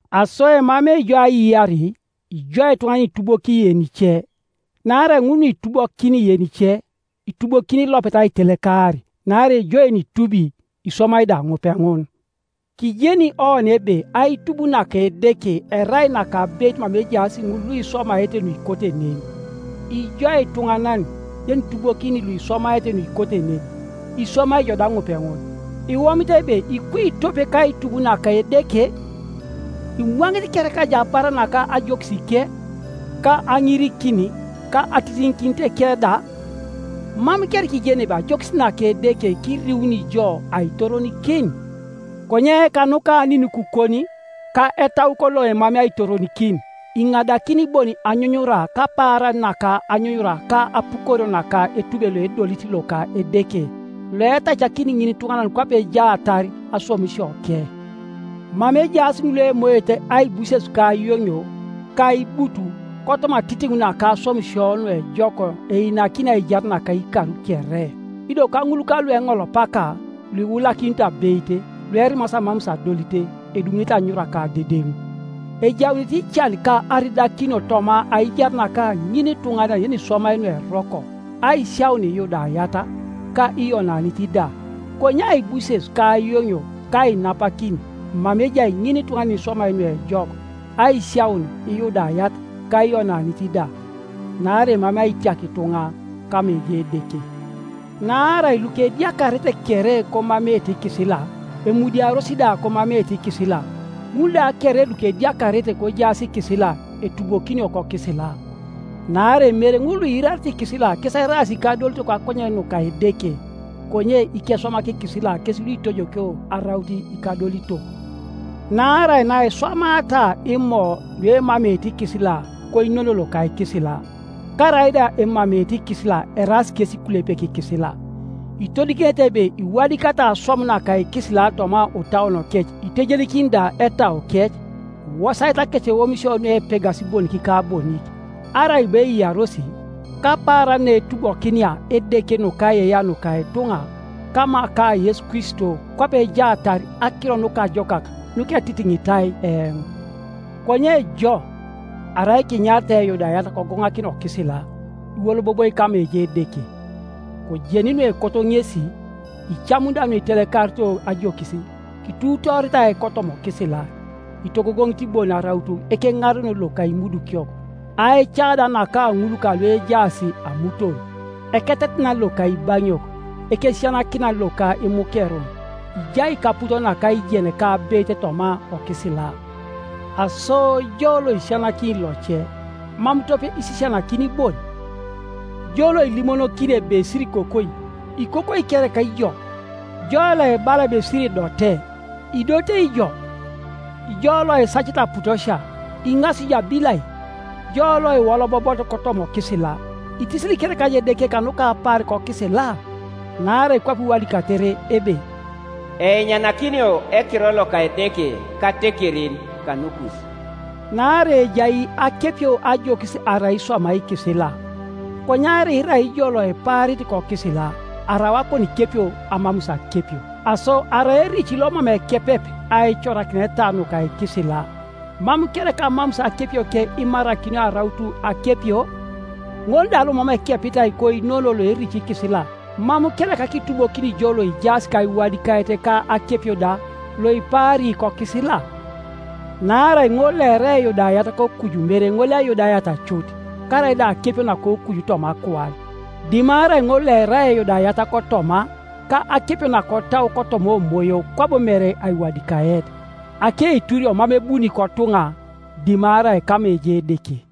Aso emamei jo aiyar, ijo ituŋanan yenitubokini yenice; naarai ŋun nuitubokini yenice, itubokin ilopet aitelekar, naarai jo yenitubi, iswamai da ŋupeŋun, Kijeni oni ebe aitub naka Edeke erai nakabeit mama ejaas ŋul luiswamaete nuikote nen. Ijo ituŋanan, yenitubokini luiswamaete nuikote nen, iswamai ijo da ŋupeŋun, iwomit ebe ikui tope kaitub naka Edeke? Imwaŋit kereka ijo abar naka ajokisike, ka aŋirikin, ka atitiŋikinitike da? Mam kereka ijeni ebe ajokis naka Edeke kiriuni jo aitoronikin? Konye kanuka aninikukon, ka etaukon loemamei aitoronikin, iŋadakin bon anyunyura kapaaran naka anyunyura ka apukorio naka etube loedolit loka Edeke, loetacakini ŋinituŋanan kwape ejaatar aswamisioke; mama ejaas ŋul luemoete aibuses ka ayoŋio, ka aibut, kotoma atitiŋ naka aswamisio nuejok einakini aijar naka ikar kere. Ido kaŋul kalueŋolopaka, luiulakinito abeit, luerimasi amamus adolit, edumunete anyunyura ka adedeŋ. Ejaunete ican ka aridakinio toma aijar naka ŋinituŋanan yeniswamai nueroko, aisiaun lyudayat, ka Iyonanit da, konye aibuses ka ayoŋio ka ainapakin mama ejai ŋinituŋanan yeniswamai nuejok, aisiaun Iyudayat, ka Iyonanit da. Naarai emamei aitiak ituŋa kama ejai Edeke. Naarai lukediakarete kere komameete ikisila, emudiaros da komameete ikisila, ŋul da kere lukediakarete kojaas kikisila, etubokinio kokisila. Naarai mere ŋul luiirarete ikisila kes eraas ikadolitok kakonyen nuka Edeke, konye ikeswamak ikisila kes luitojokio araut ikadolitok. Naarai naiswamaata Imo luemameete ikisila koinono loka ikisila, karaida emameete ikisila eraas kesi ikulepek ikisila. Itodikinete ebe iwadikatai aswam naka ikisila toma otauonokec itejenikini da etaukec, iwosaete akeceomisio nuepegasi bonik ka bonik, arai bo eiyaros; kapaaran naetubokinia Edeke nukaiyeiyea nuka ituŋa kama ka Yesu Kristo kwape ejaatar Akiro Nukajokak nuketitiŋitai eoŋ. Konye jo, arai kinyaritai Eyudayat kogoŋakina okisila, iwoloboboi kama ejai Edeke, kojeni nuekoto ŋesi, icamuni da nuitelekarito ajokis, kituutooritai kotoma okisila, itogogoŋit bon araut ekeŋarenon loka imudukiok, aica da naka ŋul kaluejaas amuton, eketetenan loka ibaŋiok, ekesisianakinan loka imukerun, ijai kaput naka aijen ka abeit toma okisila, aso jo loisisianakini loce, mam tope isisianakini bon? Jo loilimonokini ebe Sirikokoi, ikokoi kereka ijo? Jo loibala ebe Siridote, idotei ijo? Jo loisacit aputosia, iŋasi ijo abilai? Jo loiwolobobot kotoma okisila, itisili kereka Edeke kanuka apaar kokisila? Naarai kwape iwadikatere ebe, “Einyanakinio ekiror loka Edeke katekerin kanukus.” Naarai ejai akepio ajokis arai iswamai ikisila; konye arai irai ijo loipaarit kokisila, arau akonikepio amamus akepio. Aso arai erici lomam ekepep aicorakineta nuka ikisila, mam kereka amamus akepioke imarakinio araut akepio? Ŋol da lomam ekepitai koinono loerici ikisila, mam kereka kitubokini jo loijaas kaiwadikaet ka akepio da, loipaari kokisila? Naarai ŋol loerai Eyudayat kokuju mere ŋol Eyudayat cut, karaida akepio nakokuju toma akuan; dimarai ŋol loerai Eyudayat kotoma, ka akepio nakotau kotoma omoyo kwabo mere aiwadikaet. Akeiturio mam ebuni kotuŋa dimarai kama ejai Edeke.